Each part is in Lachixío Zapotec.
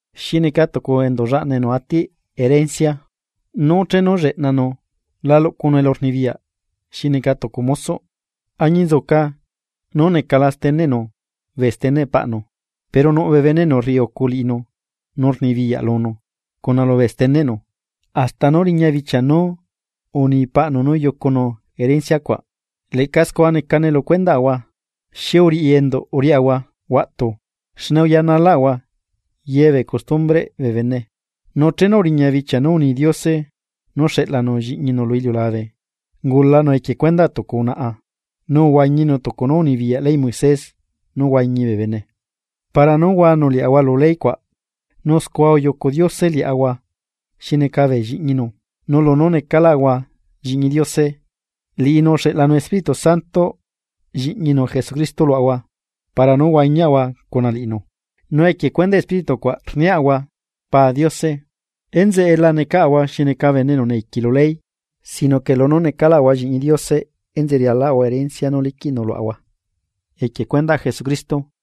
Xi neca tucu enduꞌ llaꞌna enu atiꞌ herencia, nú chenu lleꞌnanu la luꞌcunu elurnibiya xi neca tucu mosoꞌ, añinzuca nú necala steneꞌnu, bee steneꞌ paꞌnu. Pero nuꞌ bee bene enu rriucu liꞌinu nu rnibiyaꞌ lunu cuna lubee steneꞌnu hasta nú riña bichia nú uni paꞌnu nú yucunu herencia cuaꞌ. Leꞌca scua necane lu cuendaꞌahua, xi uriꞌi enduꞌ uriaꞌahua huaꞌtu xne uyanalaꞌahua ye bee costumbreꞌ bee bene. Nu chenu uriña bichia nú uni Diose nú xeꞌlanu lliꞌñinu lu iliulabe, ungulanu equie cuendaꞌ tucu unaꞌa. Nu uhuañinu tucu nú unibiyaꞌ leyꞌ Moisés nú huañi bee bene. Para nú uhuanu liaꞌahua lu ley cuaꞌ, nu scua yucu Diose liaꞌahua xi neca bee lliꞌñinu. Nu lunú necaꞌlaꞌahua lliꞌñi Diose, liꞌinu uxeꞌlanu Espíritu Santoꞌ lliꞌñinu Jesucristo luaꞌahua para nú huañiaꞌahua cuna liꞌinu, nu equie cuendaꞌ Espíritu cuaꞌ rniaꞌahua: “¡Pa Diose!” Enzeꞌe la necaꞌahua xi neca esclavo lu ley sino que lunú necaꞌlaꞌahua lliꞌñi Diose, enzeꞌe rialaꞌahua herencia nú liquiꞌnu luaꞌahua equie cuendaꞌ Jesucristo.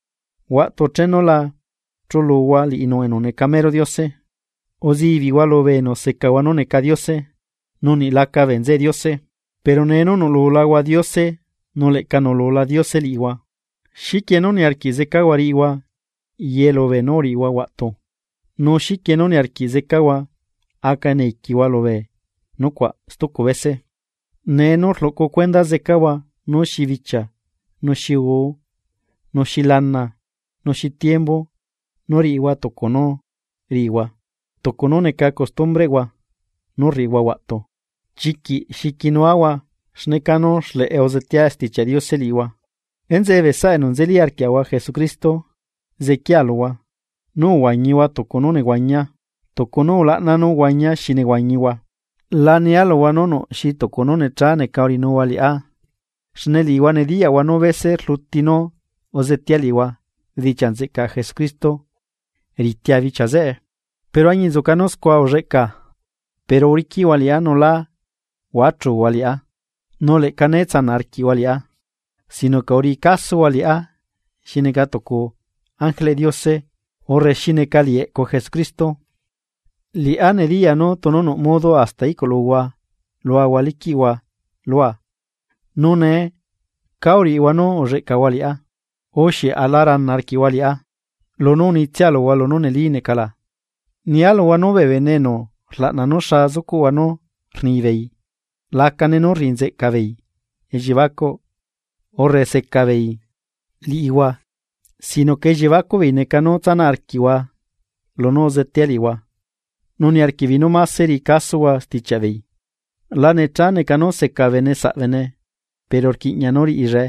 Huaꞌtu chenu la chuluhua liꞌinu enu neca mero Diose, uzibiꞌhua lubee enu secahua nú neca diose, nu niꞌ laca bee nzeꞌe Diose. Pero nee nú nuꞌlulahua Diose nu leꞌca nuꞌlula Diose liꞌihua, ¿xiquie nú niarquiꞌ zecahua riꞌihua yelu beenú uriꞌihua huaꞌtu? ¿Nu xiquie nú niarquiꞌ zecahua nú aca zecahua esclavo lubee nucuaꞌ stucu bese? Nee nú rluꞌcu cuenda zecahua nú xi bichia nu xi uu nu xi lana nu xi tiembu nú riꞌihua tucu nú riꞌihua tucu nú neca costumbreꞌhua nú rriꞌihua huaꞌtu. ¡Chiquiꞌ xiquinuahua xne canú xleꞌe uzetea Stichiaꞌ Diose liꞌihua! Enzeꞌe bee saꞌa enu nzeli arquiaꞌahua Jesucristo zequiaa luhua: Nú uhuañihua tucu nú nehuañia, tucu nú ulaꞌna nú uhuañia xi nehuañihua, la nia luhua nú nuꞌ xi tucu nú necha neca uriꞌinuhua liꞌá. Xne liꞌihua nediyaꞌhua nú bese rluti nú uzetea liꞌihua bedichiaꞌ nzeꞌcaꞌ Jesucristo, ritia bichia zeꞌe. Pero añinzuca nú scua ulleꞌca pero uriquiꞌhua liꞌá nu lá huachuhua liꞌá nu leꞌca né tsanaꞌ arquiꞌhua liꞌá, sino que uriꞌi casohua liꞌá xi neca tucu ángeleꞌ Diose urre xi neca liꞌi eꞌcu Jesucristo. Liꞌá nediyaa nú tunu nuꞌ modo hasta iꞌculuhua luahua liquiꞌhua lua. Nu nee, ¿cá uriꞌihua nú uzecahua liꞌá? U, ¿xieꞌ aꞌla rana arquiꞌhua liꞌá, lunú unitsia luhua lunú neli neca la? Nia luhua nú bee bene enu rlaꞌna nú xa zucuꞌhua nú rnibeei lacane nú rriꞌi nzeꞌcabeei elliebacuꞌ urre secabeei liꞌihua sino que elliebacuꞌbeei neca nú tsanaꞌ arquiꞌhua lunú uzetea liꞌihua nu niarquiꞌbeei nú máse riꞌi casohua stichiaꞌbeei. La necha neca nú seca bene saꞌbene pero rquiꞌña nú riꞌillae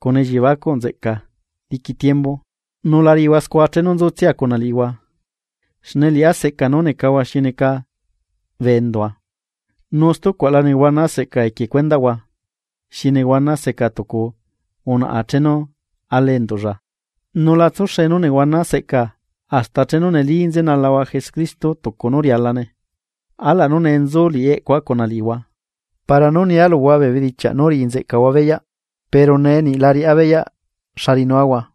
cuna elliebacuꞌ nzeꞌca diqui tiembu, nu la riꞌihua scua chenu nzutsia cuna liꞌihua. Xne liꞌá seꞌca nú necahua xi neca bee endua. Nu stucuaꞌla nehuana seꞌcaa equie cuendaꞌhua xi nehuana seca tucu unaꞌa chenu ala enduꞌlla. Nu la tsuxe nú nehuana seꞌcaa hasta chenu neli nzenalahua Jesucristo tucu nú rialane. ¡Alaꞌ nú nee nzu liꞌi eꞌcua luhua para nú nia luhua bee bedichiaꞌ nú riꞌi nzeꞌcahua beyaꞌ pero nee niꞌ la riꞌá beyaꞌ xa riꞌinuahua!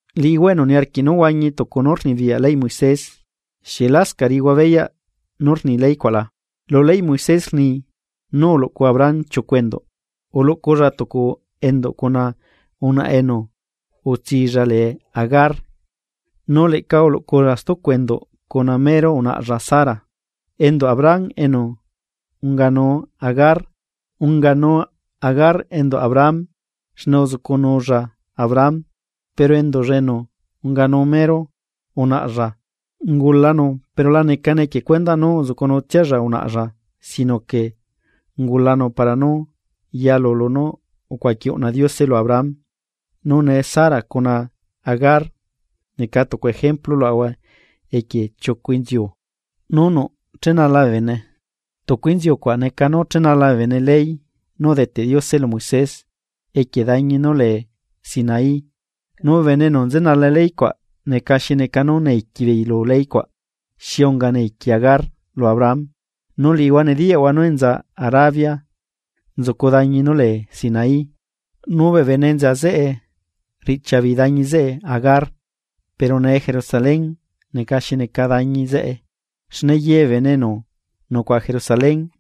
Liꞌihua enu niarquiꞌ nú huañi tucu nú rnibiyaꞌ leyꞌ Moisés. ¿Xieꞌ lascaꞌ riꞌihua beyaꞌ nú rni leycuaꞌla? Lu leyꞌ Moisés rni nú uluꞌcu Abraham chiucu enduꞌ. Uluꞌculla tucu enduꞌ cuna unaꞌa enu utsilla lee Agar nu leꞌca uluꞌculla stucu enduꞌ cuna mero unaꞌalla Sara. Enduꞌ Abraham enu unganu Agar, unganu Agar enduꞌ Abraham xne uzucunulla Abraham. Pero enduꞌlla enu unganu mero unaꞌlla, ungulanu pero la necane equie cuendaꞌ nú uzucunutsialla unaꞌlla, sino que ungulanu para nú yalu lunú ucuaqui uꞌna Diose lu Abraham. Nu nee Sara cuna Agar, neca tucu ejemplu luaꞌahua equie chiucu inziu nú nuꞌ chenala bee bene, tucu inziu cuaꞌ neca nú chenala bee bene ley nú udeteꞌ Diose lu Moisés equie dañi nú lee Sinaí, nu bee enu nzenala ley cuaꞌ neca xi neca esclavo lu leycuaꞌ xi unga Agar esclavo lu Abraham. Nu liꞌihua nediyaꞌhua nú enza Arabia nzucu dañi nú lee Sinaí nu bee bene enza zeꞌe rriꞌchiabeei dañi zeꞌe Agar. Pero nee Jerusalén neca xi neca dañi zeꞌe xne yebee bene enu nucuaꞌa Jerusalén,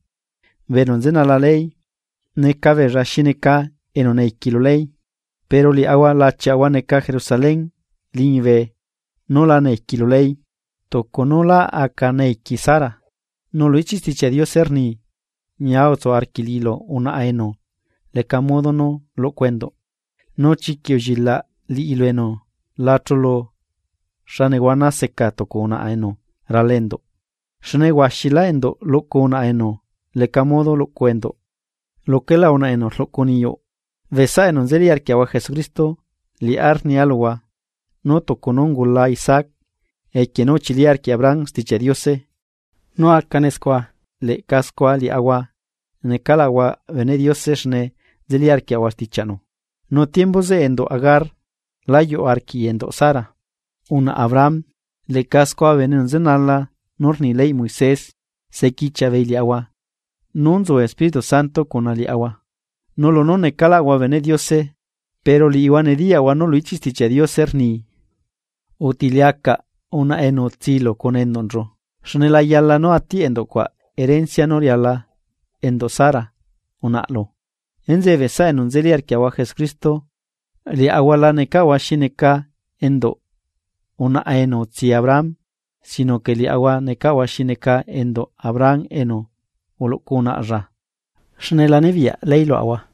bee enu nzenala ley, neca beella xi neca esclavo lu ley. Pero liaꞌahua lachiaꞌahua neca Jerusalén liñibe nú laca esclavo lu ley, tucu nú lá aca Sara esclavo. Nu lu ichiꞌ Stichiaꞌ Diose rni: Ñia utsu arquiꞌ liꞌilu unaꞌa enu leca modo nú luꞌcu enduꞌ; nu chiquiꞌ ullilaꞌ liꞌilu enu la chulu xa nehuana seca tucu unaꞌa enu rala enduꞌ. Xne huaxilá enduꞌ luꞌcu unaꞌa enu leca modo luꞌcu enduꞌ luquela unaꞌa enu rluꞌcu niyuꞌ. Bee saꞌa enu nzeli arquiaꞌahua Jesucristo liꞌá rnia luhua nú tucu nú ungula Isaac equie nú uchili arquiꞌ Abraham Stichiaꞌ Diose nú acane scua leꞌca scua liaꞌahua necaꞌlaꞌahua beneꞌ Diose xne nzeli arquiaꞌahua stichiaꞌnu. Nu tiembu zeꞌe enduꞌ Agar, la yuꞌ arquiꞌi enduꞌ Sara unaꞌa Abraham. Leꞌca scua bee bene enu nzenala nú rni leyꞌ Moisés sequichiaꞌ beei liaꞌahua nú nzu Espíritu Santo cuna liaꞌahua, nu lunú necaꞌlaꞌahua beneꞌ Diose. Pero liꞌihua nediyaꞌhua nú lu ichiꞌ Stichiaꞌ Diose rni: “Uteliacaꞌ unaꞌa enu utsilu cuna enduꞌnchu, xne la yala nú atiꞌ enduꞌ cuaꞌ herencia nú riala enduꞌ Sara unaꞌalu.” Enzeꞌe bee saꞌa enu nzeli arquiaꞌahua Jesucristo liaꞌahua la necaꞌahua xi neca enduꞌ unaꞌa enu utsi Abraham sino que liaꞌahua necaꞌahua xi neca enduꞌ Abraham enu uluꞌcu unaꞌlla xne la nibiyaꞌ ley luaꞌahua.